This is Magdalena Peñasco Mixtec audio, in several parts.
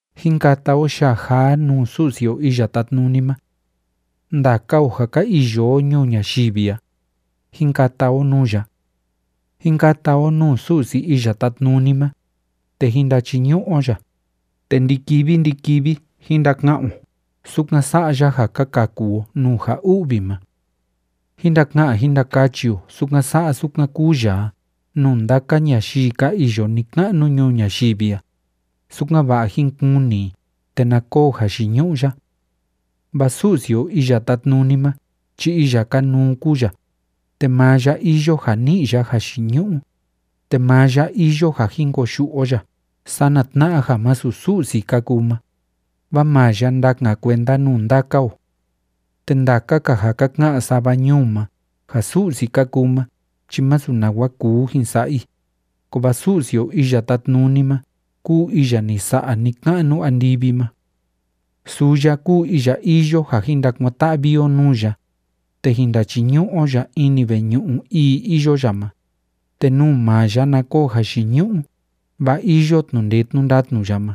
Jín kata o yaa jaa nuu Su'si o Iya Tátnuni ma. Ndaka o ja ka iyo o ñuu ñayivi a, jín kata o nuu ya. Jín kata o nuu Su'si Iya Tátnuni ma, te jín ndachiñu'u o ya, te ndi‑kivi ndi‑kivi jín ndaka'an o sukan sa'a ya ja ka kaku o nuu ja u'vi ma. Jín ndaka'an jín ndakachi o sukan sa'a sukan kúu ya a nuu ndaka ñayii ka iyo ni‑ka'nu ñuu ñayivi a, sukan‑va'a jín kuni i te na koo jayiñu'u ya. Vaa Su'si o Iya Tátnuni ma chi iya kanuu kúu ya, te maa ya iyo ja ni'i ya jayiñu'u, te maa ya iyo ja jin koyu'u o ya sana tna'a ja masu Su'si ka kuu ma, vaa maa ya ndakan kuenda nuu ndaka o. Te ndaka‑ka ja ka ka'an sava ñuu ma ja su'si ka kuu ma chi másu nawa kuu jin sa'a i, kovaa Su'si o Iya Tátnuni ma kúu iya ni sa'a ni‑ka'nu andivi ma. Suu ya kúu iya iyo ja jin ndakuan‑ta'vi o nuu ya, te jín ndachiñu'u o ya ini veñu'u ii iyo ya ma, te nuu maa ya na koo jayiñu'u, vaa iyo tnu'u ndee tnu'u ndatnu ya ma.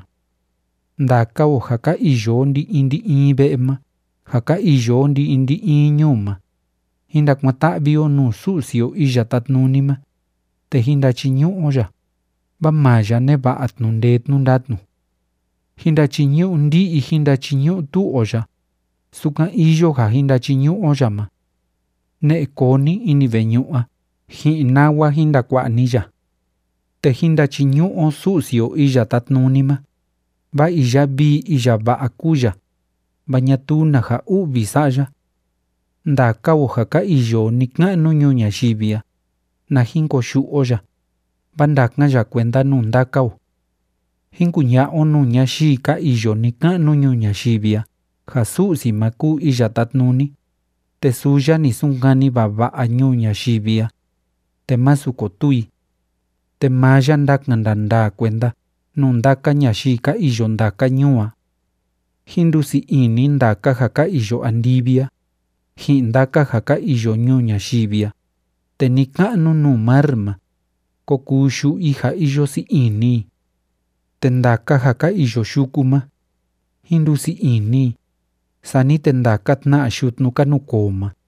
Ndaka o ja ka iyo o ndi‑in ndi‑in ve'e ma ja ka iyo o ndi‑in ndi‑in ñuu ma, jín ndakuan‑ta'vi o nuu Su'si o Iya Tátnuni ma, te jín ndachiñu'u o ya, vaa maa ya neva'a tnu'u ndee tnu'u ndatnu. Jín ndachiñu'u ndi'i jín ndachiñu'u tu'u o ya, sukan iyo ja jin ndachiñu'u o ya ma. Ne'e koo ni ini veñu'u a ji'in nawa jin ndakua'a ni ya. Te jín ndachiñu'u o Su'si o Iya Tátnuni ma, vaa iya vii iya va'a kúu ya, vaa ñatuu na ja u'vi sa'a ya. Ndaka o ja ka iyo o ni‑ka'nu ñuu ñayivi a, na jin koyu'u o ya, vaa ndakan ya kuenda nuu ndaka o. Jín kuña'a o nuu ñayii ka iyo ni‑ka'nu ñuu ñayivi a ja Su'si ma kúu Iya Tátnuni, te suu ya ni sunkani vava'a ñuu ñayivi a, te masu kotuu i. Te maa ya ndakan ndandaa kuenda nuu ndaka ñayii ka iyo ndaka ñuu a. Jín ndusii ini ndaka ja ka iyo andivi a, ji'in ndaka ja ka iyo ñuu ñayivi a, te ni‑ka'nu nuu mar ma, kó kuu yu'u i ja iyo sii ini i. Te ndaka ja ka iyo yuku ma, jín ndusii ini i, sani te ndaka tna yutnu ka nukoo ma,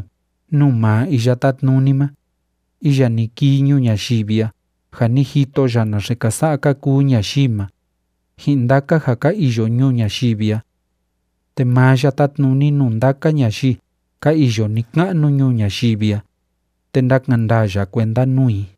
nuu maa Iya Tátnuni ma, iya ni kii ñuu ñayivi a ja ni jito ya naxe ka sa'a ka kuu ñayii ma, ji'in ndaka ja ka iyo ñuu ñayivi a. Te maa ya tátnuni nuu ndaka ñayii ka iyo ni‑ka'nu ñuu ñayivi a, te ndakan ndaa ya kuenda nuu i.